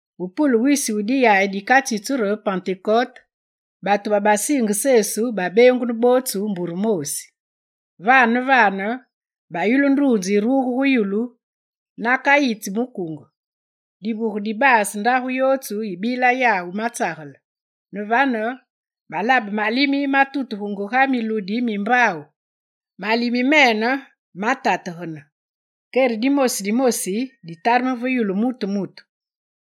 Ve pule wisi wu diyayi dikatsitsu re Pentekote, batu babasiinge Sesu babeengunu bootsu mbure moosi. Vane ne vane, bayulu nduunze yiruge gu yulu ga nakayitsi mukunge. Divuge dibaase ndagu yootsu yibila yawu matsagele. Ne vane, balabe malimi matutugenge ga miludi mi mbaawu, malimi mene matategane. Kere dimoosi dimoosi ditareme ve yulu muru mutu mutu.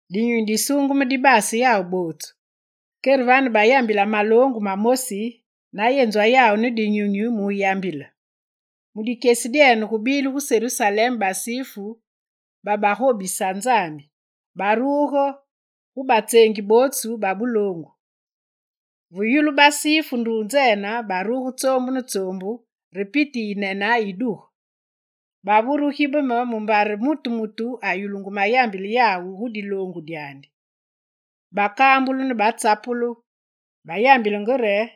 Dinyunyi Disuungeme dibaase yawu bootsu. Kere vane bayambila maloongu mamosi na yenzwa yawu ne Dinyunyi muyambile. Mu dikyesi dyene gubile gu Serusalem basifu babagobisa Nzambi, baruge gu batseengi bootsu babuloongu. Ve yulu basifu nduunzene, baruge tsoombu ne tsoombu re piti yinene yiduge. Bavure wugibeme mumbare mutu mutu ayulungu mayambila yawu gu diloongu dyandi. Bakambulu ne batsapulu, bayambile re: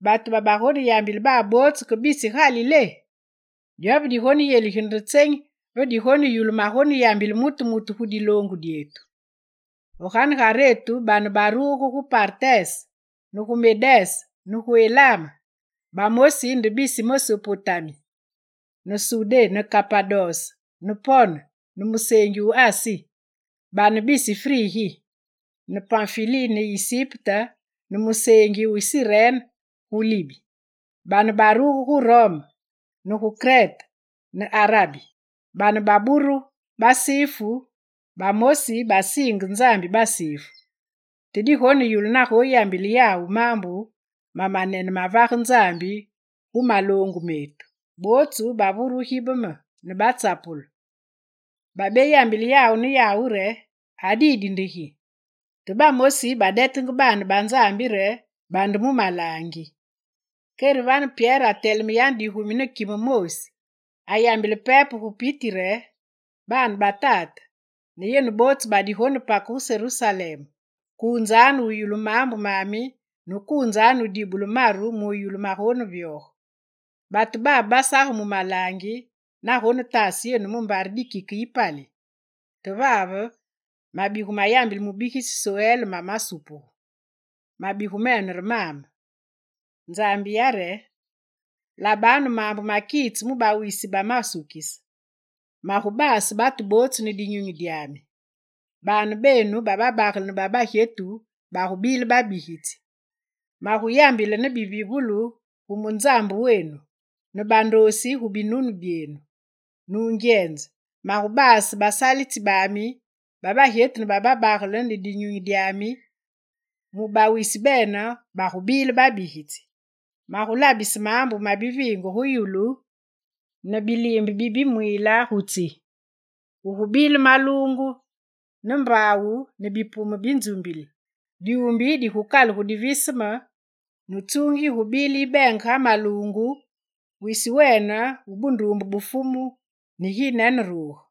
«Batu babagoneyambile babe bootsu ke bisi Galilé? Dyove digoneyendigile nde tsenyi ve digoneyulu magoneyambile mutu mutu gu diloongu dyetu? Ve ganegaretu bane baburugu gu Partes, ne gu Medes ne gu Elam. Bamosi nde bisi Mesopotami ne Sudé ne Kapados ne Pon ne museengi wu Asi, bane bisi Frigi ne Panfili ne Isipte ne museengi wu Sirene gu Libi, bane baruge gu Rome, ne gu Krete ne Arabi. Bane baburu basifu, bamosi basiinge Nzambi basifu. Te digoneyulu nagoneyambile yawu maambu ma manene ma vage Nzambi gu maloongu metu.» Bootsu bavure wugibeme ne batsapulu. Babeyambila yawu ne yawu re: «A didi nde gi?» Te bamosi badetenge baane ba Nzambi re: «Bande mu malaangi!» Kere vane Pyere ateleme yane digumi ne kime moosi; ayambile pepe gu piti re: «Baane ba tate ne yenu bootsu badigonepake gu Serusalem, kuunzanu wuyulu maambu mami ne kuunzanu wudibule maru muyulu magonevyoge. Batu babe basaga mu malaangi na gonetaase yenu mumbare dikike yipali. Te vave mabigu mayambile mubigitsi Sowel mamasupugu. Mabigu mene re mame: “Nzambi yare: Labanu maambu makitse mu bawisi bamasukise: Magubaase batu bootsu ne Dinyunyi dyami. Baane benu bababagele ne babagyetu bagubile babigitsi. Maguyambile ne bivivulu gu munzambu wenu, ne bandoosi gu binunu byenu. Nungyenze, magubaase basalitsi bami babagyetu ne bababagele ne Dinyunyi dyami, mu bawisi bene bagubile babigitsi. Magulabise maambu ma biviinge gu yulu ne biliimbe bi bimwiile gu tsi: Gugubile maluungu ne mbaawu ne bipume bi nzumbili, dyuumbi digukalugu diviseme ne tsuungi yigubile yibeenge ga maluungu, wisi wumunene wu bunduumbe bu Fumu neginene ruge.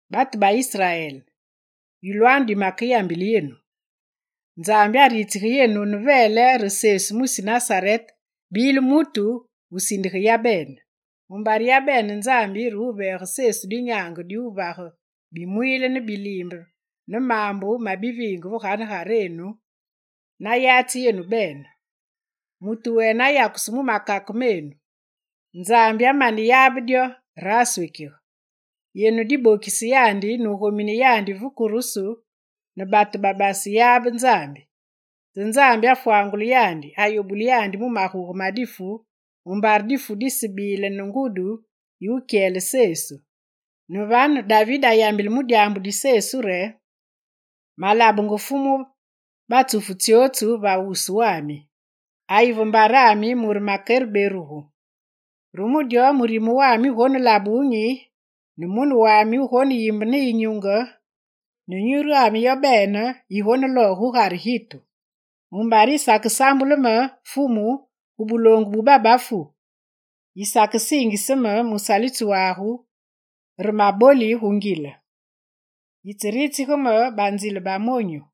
Batu ba Israel, yulwanu dimekeyambile yenu: Nzambi aritsige yenu ne veele re Sesu mwisi Nasarete bile mutu wusindige yabene. Mumbare yabene Nzambi re wuveege Sesu dinyaange diwuvage bimwiile ne biliimbe ne maambu ma biviinge ve ganegarenu, na yatsi yenu bene. Mutu wene ayakusu mu makake menu. Nzambi amaneyabe dyo re aswekige. Yenu dibokise yandi nugominise yandi ve kurusu ne batu babaseyabenge Nzambi. Te Nzambi afwangule yandi, ayobule yandi mu maguge ma difu mumbare difu disebile ne ngudi yi wukyele Sesu. Ne vane, David ayambile mu dyaambu di Sesu re: “Malabenge Fumu batsufu tsyootsu va wuswami, ayi ve mbarami mure makere berugu. Re mu dyo murime wami wugonelabe wunyi, ne mune wami wugoneyimbe ne yinyunge, ne nyurwami yobene yigulooge gugare gitu. Mumbare yisakesambule me, Fumu, gu buloongu bu babafu, yisakesiingise me musalitsi wagu re maboli gu ngile. Yitseritsige me banzile bamonyu.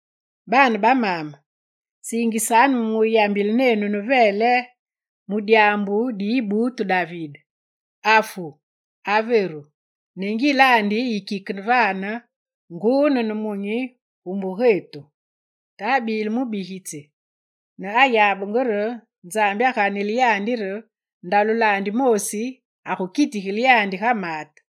Baane ba maame, siingisanu me muyambile nenu ne veele mu dyaambu di yibuutu David: afu, averu, ne ngilandi yikike vane nguu ne nemunyi gu mbugetu. Te abile mubigitsi ne ayabenge re Nzambi aganile yandi re ndalulandi moosi agukitigile yandi ga maate.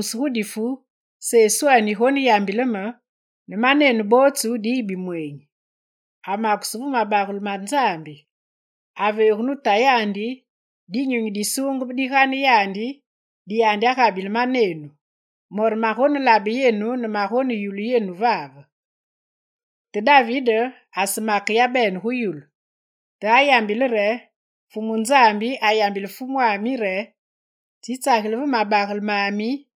Nzambi araambuse gu difu Seswene yigoneyambile me, ne manenu bootsu diyi bimweenyi. Amakusu ve mabagele ma Nzambi, aveegu ne Tayandi Dinyunyi Disuungeme digane yandi, di yandi agabile manenu. Mo re magonelabe yenu ne magoneyulu yenu vave. Te David asemake yabene gu yulu, te ayambile re: “Fumu Nzambi ayambile Fumwami re: tsitsageli ve mabagele mami,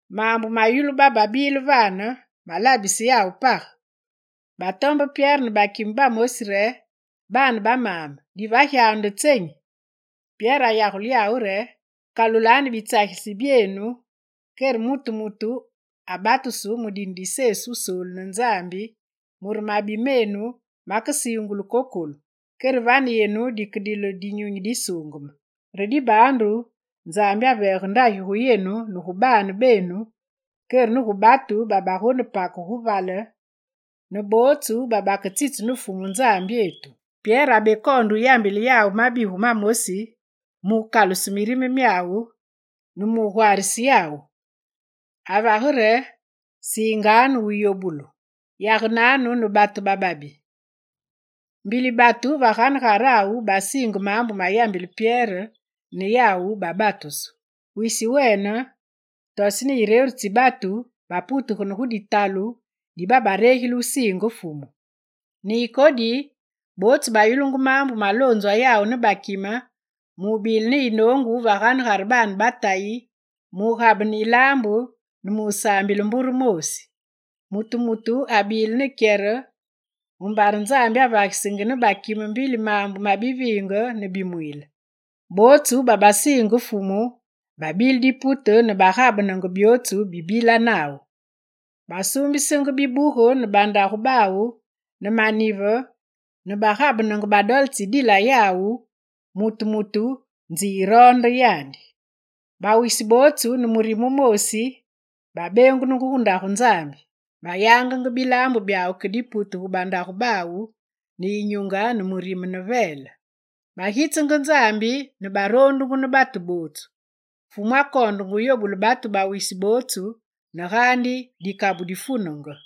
Maambu mayulu bababile vane, malabise yawu page. Batombe Pyere ne bakime bamosi re: «Baane ba maame, divagyanu nde tsenyi?» Pyere ayagule yawu re: «Kalulanu bitsagilitsi byenu kere mutu mutu abatusu mu dine di Sesu Wusoolu ne Nzambi, mure mabi menu makesiingulu kokolu. Kere vane yenu dikedile Dinyunyi Disuungeme. Re dibaandu Nzambi aveege ndagi gu yenu ne gu baane benu kere ne gu batu babagonepake gu vale, ne bootsu baketsitsu ne Fumu Nzambyetu.» Pyere abekoonde yambile yawu mabigu mamosi mukaluse mirime myawu ne mugwaarise yawu, avage re: «Siinganu wuyobulu. Yagenanu ne batu bababi.» Mbili batu va ganegarawu basiinge maambu mayambila Pyere ne yawu babatusu. Wisi wene, toseni yireru tsi batu baputegane gu ditalu di babaregile wusiinge Fumu. Ne ikodi, bootsu bayulungu maambu maloonzwa yawu ne bakime, mubile ne yinoongu va ganegare baane ba Tayi, mugabene yilaambu ne musaambile mbure moosi. Mutu mutu abile ne kyere, mumbare Nzambi avagisenge ne bakime mbili maambu ma biviinge ne bimwiile. Bootsu babasiinge Fumu babile dipute ne bagabenenge byootsu bibila nawu. Basuumbisenge bibuge ne bandagu bawu ne manive ne bagabenenge badole tsidila yawu, mutu mutu nzi yiroonde yandi. Bawisi bootsu, ne murime wumoosi babeengunungu gu Ndagu Nzambi. Bayangenge bilaambu byawu ke dipute gu bandagu bawu ne yinyunge ne mirime ne veele. Bagitsenge Nzambi ne baroondungu ne batu bootsu. Fumu akoondenge wuyobule batu bawisi bootsu ne gaandi dikabu difunenge.